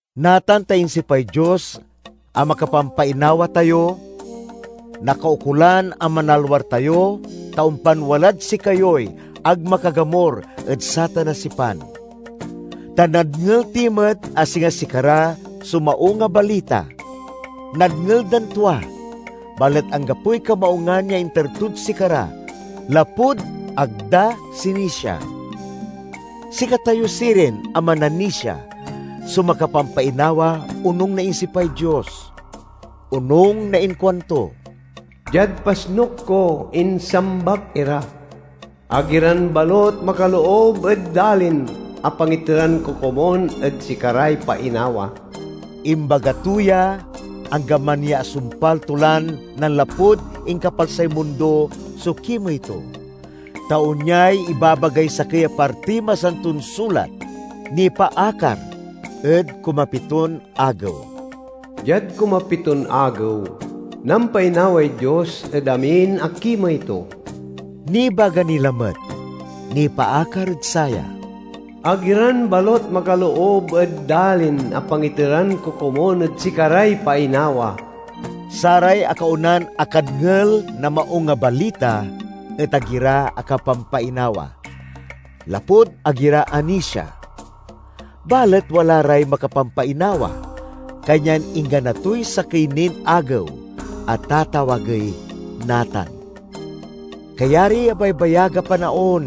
Natan ta insipay Dios a makapampainawa tayo, nakaukolan a manalwar tayo ta ompan walad sikayoy ag makagamur ed satan a sipan. Ta nadngel ti met a singa sikara so Maung a Balita. Nadngel dan tua, balet anggapoy kamaungan ya inter tod sikara lapud ag da sinisia. Sikatayo sirin a mananisia so makapampainawa onung na insipay Dios. Onung na inkuanto, "Diad pasnuk ko, insambak ira: 'Ag iran balut makaloob ed dalin a pangiteran ko komun ed sikaray painawa?'" Imbaga to ya, anggaman ya asumpal to lan nanlapud inkapalsay mundo so kimey to. Ta onyay ibabagay sakey a partiy Masanton Sulat, nipaakar ed kumapiton agew: "Diad kumapiton agew, nampainaway Dios ed amin a kimey to." Nibaga ni lamet, nipaakar ed saya: "Ag iran balut makaloob ed dalin a pangiteran ko komun ed sikaray painawa?" Saray akaonan akadngel na Maung a Balita et ag ira akapampainawa, lapud ag ira anisia. Balet wala ray makapampainawa, kanyan inggana toy sakey nin agew a tatawagey "Natan." Kayariy abaybayag a panaon,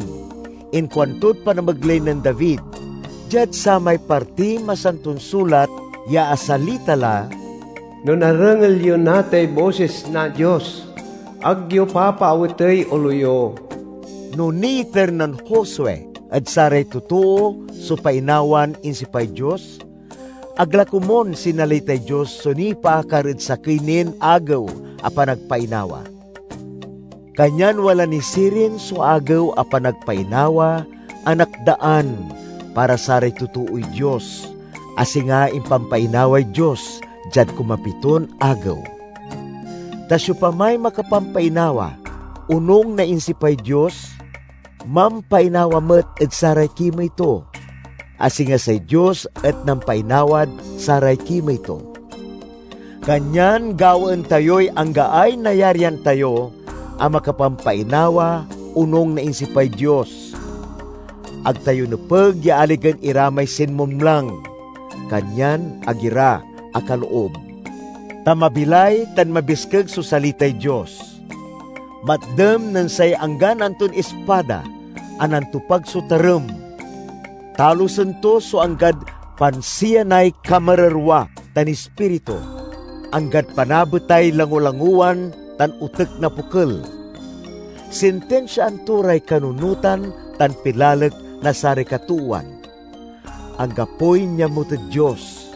inkuantod panamegley nen David diad samay partiy Masanton Sulat ya asalita la, "No narengel yo natay bosis na Dios, ag yo papaawetey olo yo." No niiter nen Josue ed saray totoo so painawan insipay Dios, ag la komun sinalitay Dios so nipaakar ed sakey nin agew a panagpainawa. Kanyan wala ni sirin so agew a panagpainawa a nakdaan para saray totooy Dios, a singa impampainaway Dios diad kumapiton agew. Ta siopamay makapampainawa onung na insipay Dios, mampainawa met ed saray kimey to, a singa say Dios et nampainawad saray kimey to. Kanyan gawaen tayoy anggaay nayarian tayo a makapampainawa onung na insipay Dios. Ag tayo nepeg ya aligen ira may sinmumlang, kanyan ag ira akaloob. Ta mabilay tan mabiskeg so salitay Dios. Matdem nen say anggan anton ispada a nantopag so tarem; talusen to so anggad pansiyanay kamarerwa tan ispiritu, anggad panabetay langolangowan tan otek na pokel. Sintinsiaan to ray kanunotan tan pilalek na saray katoowan. Anggapoy niamut ed Dios.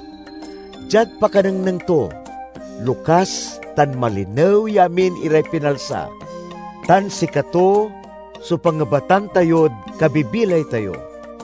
Diad pakanengneng to, lokas tan malinew ya amin iray pinalsa, tan sikato so pangebatan tayod kabibilay tayo.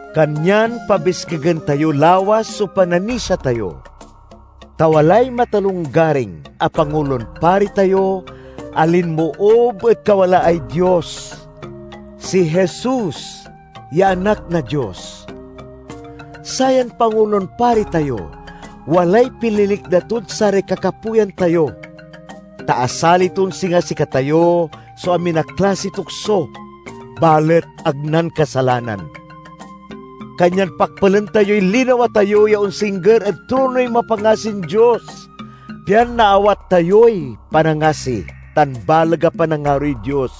Kanyan pabiskegen tayo lawas so pananisia tayo, ta walay matalonggaring a Pangulon Pari tayo a linmoob ed kawalaay Dios—si Jesus ya Anak na Dios. Sayan Pangulon Pari tayo walay pililikna tod saray kakapoyan tayo, ta asali ton singa sikatayo so amin a klasiy tukso, balet ag nankasalanan. Kanyan pakpelen tayoy linawa tayo ya onsingger ed tronoy mapangasin Dios, pian naawat tayoy panangasi tan baleg a panangaroy Dios;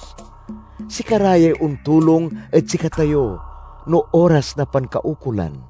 sikara yay ontulong ed sikatayo no oras na pankaukolan.